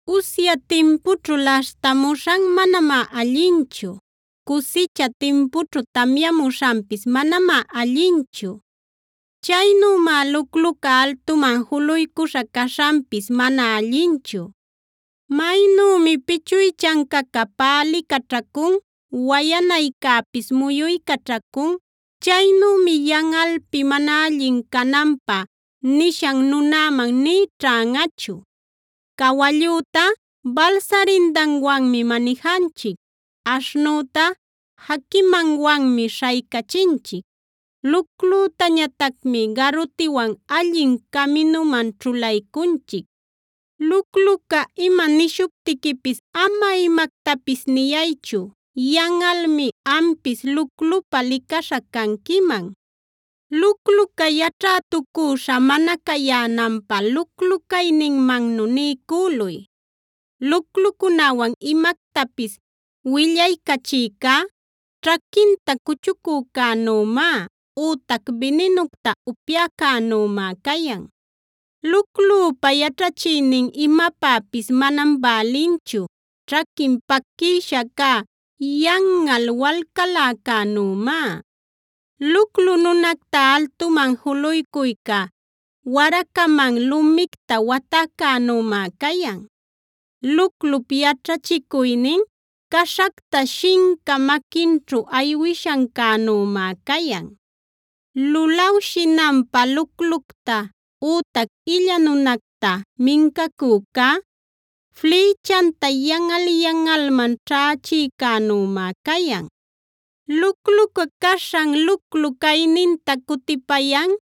Usya timpućhu laśhtamuśhan manamá allinchu; cusicha timpućhu tamyamuśhanpis manamá allinchu. Chaynümá lucluca altuman juluycuśha caśhanpis mana allinchu. Maynümi pichuychancaca pälicaćhacun, wayanaycäpis muyuycaćhacun, chaynümi yanꞌalpi mana allin cananpä nishan nunäman nï ćhanꞌachu. Cawallüta balsarindanwanmi manijanchic; aśhnüta jaquimanwanmi śhaycachinchic; luclütañatacmi garutiwan allin caminuman ćhulaycunchic. Lucluca ima nishuptiquipis ama imactapis niyaychu; yanꞌalmi ampis luclupa licaśha canquiman. Lucluca yaćhätucüśha mana cayänanpä luclu-cayninmannu niycüluy. Luclucunäwan imactapis willaycachïcá, ćhaquinta cuchucücänümá, ütac bininucta upyäcänümá cayan. Luclüpa yaćhachiynin imapäpis manam bälinchu; ćhaquin paquïsha cä yanꞌal walcaläcänümá. Luclu nunacta altuman juluycuyca, waracaman lumicta watäcänümá cayan. Luclup yaćhachicuynin caśhacta shinca maquinćhu aywishancänümá cayan. Lulawshinanpä luclucta, ütac illa nunacta mincacücá, flïchanta yanꞌal-yanꞌalman ćhächïcänümá cayan. Lucluca caśhan luclu cayninta cutipayan,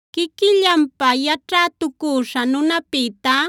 Quiquillanpä yaćhätucüśha nunapïtá,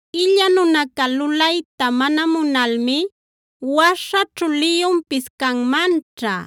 Illa nunaca lulayta mana munalmi: “Waśhaćhu liyunpis canmanćha.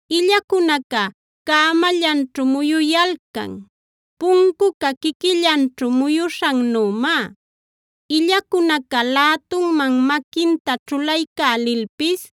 Illacunaca cämallanćhu muyuyalcan, puncuca quiquillanćhu muyuśhannümá. Illacunaca lätunman maquinta ćhulaycälilpis,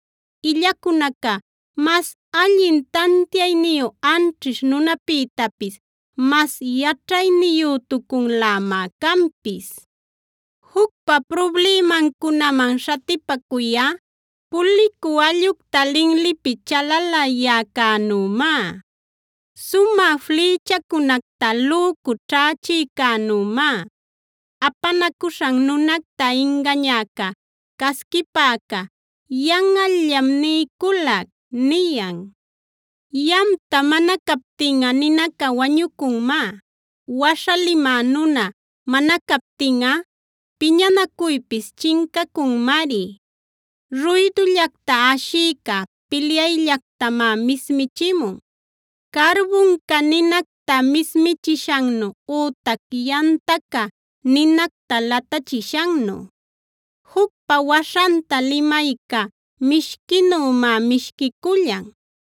Illacunaca, mas allin tantiayniyu anćhish nunapïtapis mas yaćhayniyütucunlämá canpis. Jucpa prublimancunaman śhatipacuyꞌa, pulicü allꞌucta linlipi chalalayäcänümá. Sumä flïchacunacta lücu ćhächïcänümá, apanacuśhan nunacta ingañäca, casquipäca “yanꞌallam niyculac” niyan. Yamta mana captinꞌa ninaca wañucunmá; waśha limä nuna mana captinꞌa piñanacuypis chincacunmari. Ruydullacta ashïca pilyayllactamá mismichimun, carbunca ninacta mismichishannu ütac yantaca ninacta latachishannu. Jucpa waśhanta limayca mishquinümá mishquicullan;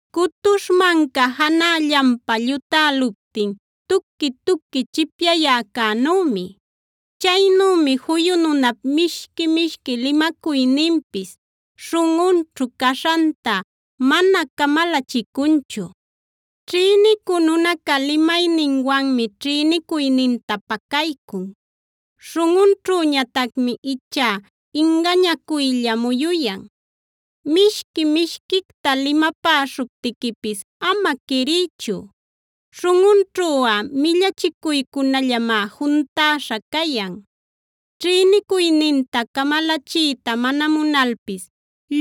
Cutuśh manca janällanpa llutäluptin tuqui-tuqui chipyayäcänümi. Chaynümi juyu nunap mishqui-mishqui limacuyninpis, śhunꞌunćhu caśhanta mana camalachicunchu. Ćhïnicü nunaca limayninwanmi ćhïnicuyninta pacaycun; śhunꞌunćhüñatacmi ichá ingañacuylla muyuyan. Mishqui mishquicta limapäśhuptiquipis ama quiriychu; śhunꞌunćhuꞌa millachicuycunallamá juntäśha cayan. Ćhïnicuyninta camalachiyta mana munalpis,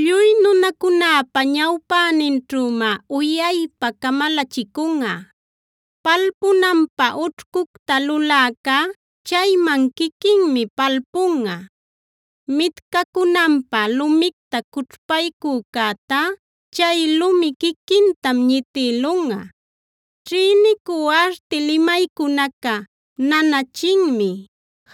lluy nunacunäpa ñawpäninćhümá uyaypa camalachicunꞌa. Palpunanpä ućhcucta luläcá chayman quiquinmi palpunꞌa; mitcacunanpä lumicta cućhpaycücätá chay lumi quiquintam ñitïlunꞌa. Ćhïnicü arti limaycunaca nanachinmi;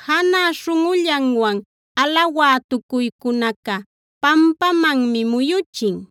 janä śhunꞌullanwan alawätucuycunaca pampamanmi muyuchin.